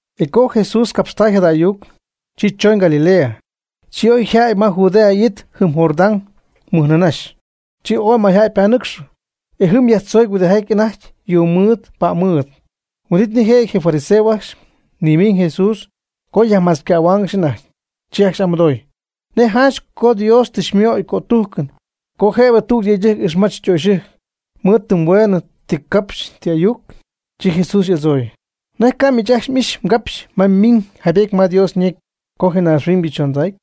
E co Jesús capxtay jada ayuc, chi choñ Galilea, chi oy yjädy ma Judea it jɨm Jordán mɨj nɨɨ nïnaxy. Chi ooy mayjäy ypanɨcxɨ, e jɨm yajtzoocy huɨdijaty anajty yuu mɨɨd pa'm mɨɨd. Huin'it nijëjɨty je fariseos ajcxy nimiiñ Jesús co yajmachcähuaangɨxy anajty. Chi ajcxy y'amɨdooy: ―¿Nej janch co Dios tɨ xymooyɨm cötujcɨn co jëbɨ tüg yëydɨjc ixmadzip ytöxyɨjc mɨɨd tɨm hueenɨ ti capxy ti ayuc? Chi Jesús y'adzooy: ―¿Nej ca'nɨ miich ajcxy m'ixy mgapxy ma ymiiñ jaybety ma Dios ñecy co je naaxhuiñybɨ chondacy,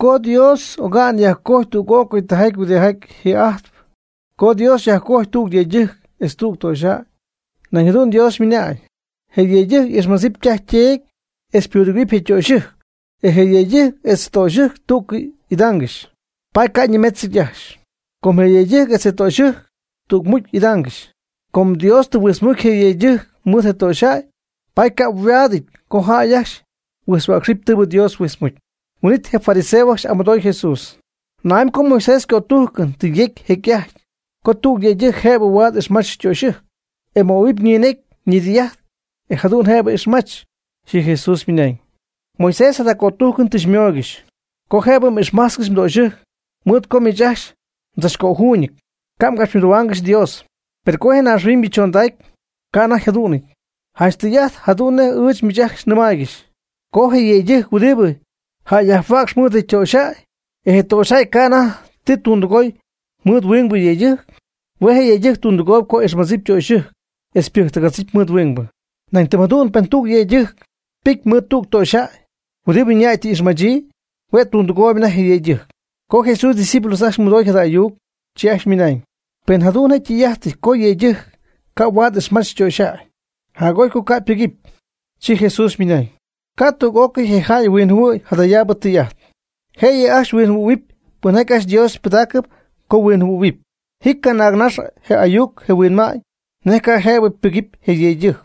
co Dios oga'ñ yajcojy tüg'ócɨy tijaty huɨdibɨ ji'ajtp co “Dios yajcojy tüg yëydɨjc etz tüg töxyjäy”? Nañ jadu'n Dios ymɨnañ: “Je yëydɨjc y'ixmadzip ytaj yteedy etz pudɨgɨ̈huɨpy je' ytöxyɨjc. E je yëydɨjc etz ytöxyɨjc tú'cɨy idaangɨxy.” Paady ca' ñimetzɨty ajcxy, com je yëydɨjc etz ytöxyɨjc tügmucy y'idaangɨxy. Com Dios tɨ huijtzmucy je yëydɨjc mɨɨd je töxyjäy, paady ca' huaadɨty co jäy ajcxy huijtzhuäcxyp tɨɨbɨ Dios huijtzmucy. Huin'it je fariseos ajcxy y'amɨdooy Jesús: ―¿Na'amy co Moisés cötujcɨn tɨ yejcy jecy'ajty co tüg yëydɨjc jëbɨ huaad ixmach ytöxyɨjc, e möhuɨpy ñinecy ñidɨy'ajt e jadu'n jëbɨ ixmach? Chi Jesús ymɨnañ: ―Moisés jada cötujcɨn tɨ xymooygɨxy co jëbɨ m'ixmajtzcɨxy mdöxyɨjc mɨɨd co miich ajcxy mdzachcöjuuñɨty, ca' mgapxymɨdohuaangɨxy Dios. Per co je naaxhuiñybɨ chondacy ca' anajty jadu'nɨty. Janch tɨy'ajt jadu'n nej ɨɨch miich ajcxy nɨmaaygɨxy co je yëydɨjc huɨdibɨ yajjayhuäcxp mɨɨd je ytöxyjäy, e je ytöxyjäy ca' anajty tɨ ytundɨgooyb mɨɨd huingbɨ yëydɨjc, hue' je' yëydɨjc ytundɨgooy co ixmach ytöxyɨjc etz ypɨjctɨgach mɨɨd huingbɨ. Nañ tɨm jadu'n pen tüg yëydɨjc ypɨcy mɨɨd tüg töxyjäy huɨdibɨ ñäy tɨ y'ixmachyii, hue' tundɨgooyb anajty je yëydɨjc. Co Jesús ydiscípulos ajcxy mɨdooy jada ayuc, chi ajcxy ymɨnañ: ―Pen jadu'n jëdu'n je tɨy'ajt co je yëydɨjc ca' huaad ixmadzip ytoxyjäy, jac'oy co ca' nbɨjcɨm. Chi Jesús ymɨnañ: ―Ca' tüg'ócɨy je jäy huinjɨhuɨ̈y jadayaabɨ tɨy'ajt. Jëyɨ ajcxy huinjɨhuɨ̈huɨp pɨn ajcxy Dios pɨdaacɨ co huinjɨhuɨ̈huɨp. Ji canaagnax je ayuc je huinma'ñ nej ca' yjëbɨty ypɨgɨpy je yëydɨjc.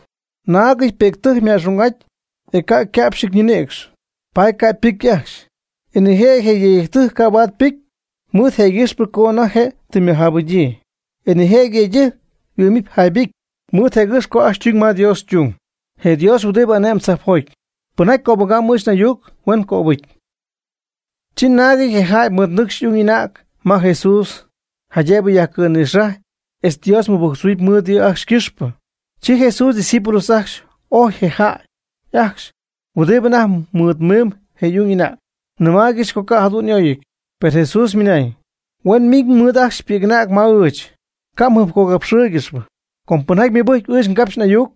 Naagɨty pi'ctɨjc yma'xung'aty e ca' yca'pxɨty ñinïcxy, paady ca' pɨcy ajcxy. E nijëjɨty je yëydɨjc ca' huaad ypɨcy, mɨɨd jëgɨxpɨ co anajty je' tɨ ymɨjaapɨgyii. E nijëjɨty yëydɨjc huɨ'my jaybɨcy mɨɨd jëgɨxp co ajcxy ytuñ ma Dios ytung, je Dios huɨdibɨ ane'myb tzajpjoty. Pɨnjaty cöbɨgamy ɨɨch n'ayuc huen cöbɨcy. Chi naagɨty je jäy mɨɨdnɨcxy y'ung y'anäg ma Jesús jaydëb yajcɨ̈nïxajɨpy etz Dios mɨbɨjctzoy mɨɨd yɨ' ajcxy ycɨxpɨ. Chi Jesús ydiscípulos ajcxy ojy je jäy ajcxy huɨdibɨ anajty mɨɨd miimb je y'ung y'anäg, nɨmaaygɨxy co ca' jadu'n y'oyɨty. Per Jesús ymɨnañ: ―Huen mɨɨd miiñ ajcxy pi'c'anäg ma ɨɨch, ca' mjɨjpcogapxɨɨygɨxy. Com pɨnjaty ymɨbɨjcp ɨɨch ngapxy n'ayuc,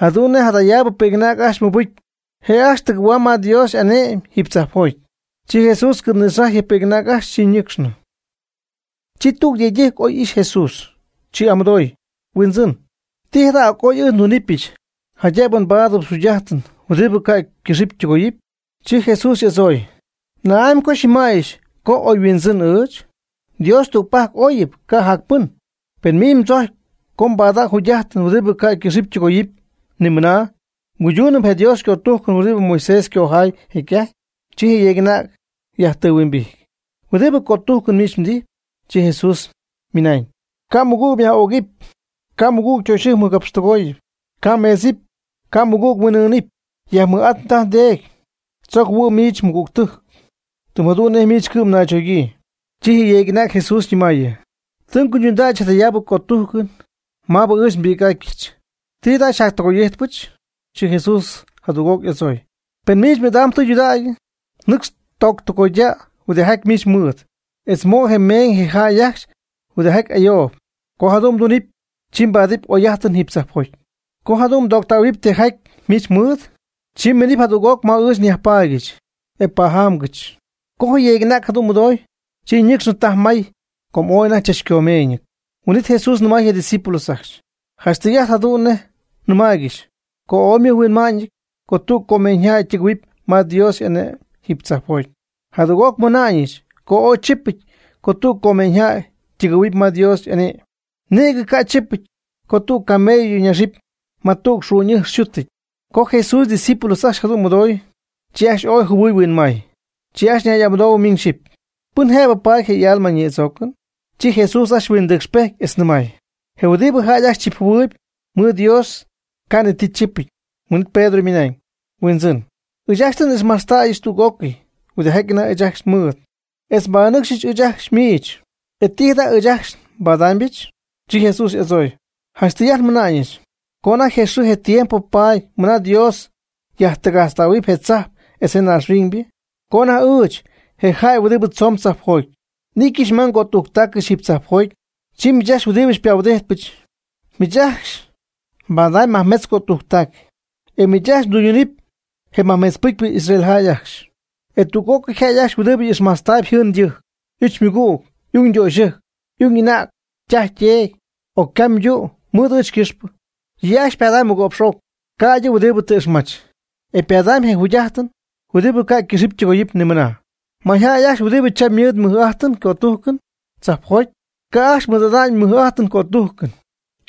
jadu'n nej jadayaabɨ pi'c'anäg ajcxy ymɨbɨcy, je' ajcxy tɨgɨ̈huam ma Dios y'ane'my jiiby tzajpjoty. Chi Jesús cɨ̈nïxajy je pi'c'anäg ajcxy. Chi ñɨcxnɨ. Chi tüg yëydɨjc oy ixy Jesús. Chi y'amɨdooy: ―Huindzɨn, ¿ti jada' co oy ɨɨch ndunɨpyɨch jaydëb nbaadɨbɨch jugy'ajtɨn huɨdibɨ ca' ycɨxɨpy ytɨgoyɨpy? Chi Jesús y'adzooy: ―¿Na'amy co xyñɨmäyɨch co oy huindzɨn ɨɨch? Dios tügpajc oyɨp, ca' jac pɨn. Pen miich mdzojcpy co mbada'ñ jugy'ajtɨn huɨdibɨ ca' ycɨxɨpy ytɨgoyɨpy nimɨna mguydunɨpy je Dios ycötujcɨn huɨdibɨ Moisés ycojaay jecy'ajty. Chi je yeeg'anäg yajtɨɨhuimbijty: ―¿Huɨdibɨ cötujcɨn miich mdijp? Chi Jesús ymɨnañ: ―Ca' mɨgüg myaj'ögɨpy. Ca' mɨgüg ytöxyɨjc mɨgapxtɨgooyɨpy. Ca' mmeedzɨp. Ca' mmɨgüg mhuin'ɨɨnɨp. Yajmɨj'at mdaj mdeedy. Mdzogɨpy mjɨhuɨ̈huɨp miich mmɨgügtɨjc, tɨm jadu'n nej miich cɨ'm mnaychogyii. Chi je yeeg'anäg Jesús nɨmaayɨ: ―Tɨ nguydundäyɨch jadayaabɨ cötujcɨn ajcxy maabɨ ɨɨch nbi'c'atyɨch. ¿Ti jada njacyajtɨgoy'ijtpyɨch? Chi Jesús jadüg'oc y'adzooy: ―Pen miich m'idam tudägy, nɨcx tooctɨgoyda' huɨdijaty miich mɨɨd, etz mo' je meeñ je jäy ajcxy huɨdijaty ayoob. Co jadu'n mdunɨpy, chi mbaadɨpy oy'ajtɨn jiiby tzajpjoty. Co jadu'n mdooctähuɨpy tijaty miich mɨɨd, chi miinɨp jadüg'oc ma ɨɨch nyajpaadyɨch, e pajamgɨch. Co je yeeg'anäg jadu'n mɨdooy, chi ñɨcxnɨ taj may com ooy anajty chachcomeeñɨty. Huin'it Jesús nɨmay je' ydiscípulos ajcxy: ―Janch tɨy'ajt jadu'n nej nɨmaaygɨxy co ooy ymɨjhuinma'ñɨty co tüg comeeñyjäy ytɨgɨ̈huɨpy ma Dios y'ane'my jiiby tzajpjoty. Jadüg'oc nmɨna'ñɨch co ooy chipɨty co tüg comeeñyjäy tɨgɨ̈huɨpy ma Dios y'ane'my, nïgɨ ca' chipɨty co tüg camello ñaxɨpy ma tüg xu'ñ'ɨjx yxutɨty. Co Jesús ydiscípulos ajcxy jadu'n mɨdoy, chi ajcxy ooy jɨhuɨy huinmay. Chi ajcxy ñay'amɨdoohuɨ miñ xyɨpy: ―¿Pɨn jëbɨ paady je' y'alma nïdzoocɨn? Chi Jesús ajcxy huindɨcxpejty etz nɨmay: ―Je huɨdibɨ jäy ajcxy chipjɨhuɨɨyb, mɨɨd Dios ca' ni ti chipɨty. Huin'it Pedro ymɨna'ñ: ―Huindzɨn, ɨɨch ajcxy tɨ n'ixmajtztäyɨch tüg'ócɨy huɨdijaty anajty ɨɨch ajcxy nmɨɨd etz nbanɨcx ɨɨch ajcxy miich. ¿E ti jada' ɨɨch ajcxy nbaadaamybɨch? Chi Jesús y'adzooy: ―Janch tɨy'ajt nmɨna'ñɨch co anajty je xɨɨ je tiempo paady mɨna Dios yajtɨgajtztähuɨpy je tzajp etz naaxhuiñybɨ, co anajty ɨɨch, je jäy huɨdibɨ tzoon tzajpjoty, n'ityɨch ma ngötujctacɨch oybɨ jiiby tzajpjoty, chi miich ajcxy huɨdi tɨ xypahuɨdityɨch, miich ajcxy mbadamy majmetz cötujctac, e miich ajcxy mdɨydunɨpy je majmetz pɨcypɨ Israeljäy ajcxy. E tüg'ócɨy jäy ajcxy huɨdibɨ tɨ ixmajtztäy yjɨɨn ytɨjc, y'uch ymɨgüg, y'ung ytöxyɨjc, y'ung y'anäg, ytaj yteedy, o ycam ytu' mɨɨd ɨɨch ycɨxpɨ, yɨ' ajcxy ypadamyb mɨgo'px'oc, ca'ydɨ huɨdibɨ tɨ ixmach. E ypadamy je jugy'ajtɨn huɨdibɨ ca' ycɨxɨpy ytɨgoyɨpy ni mɨna. Mayjäy ajcxy huɨdibɨ cham ymɨɨd mɨj'ajtɨn cötujcɨn, tzajpjoty ca' ajcxy mɨɨd'ada'ñ mɨj'ajtɨn cötujcɨn.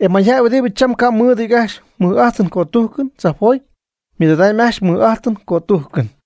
E mayjäy huɨdibɨ cham ca' mɨɨdɨty ajcxy mɨj'ajtɨn cötujcɨn, tzajpjoty ymɨɨd'adamy ajcxy mɨj'ajtɨn cötujcɨn.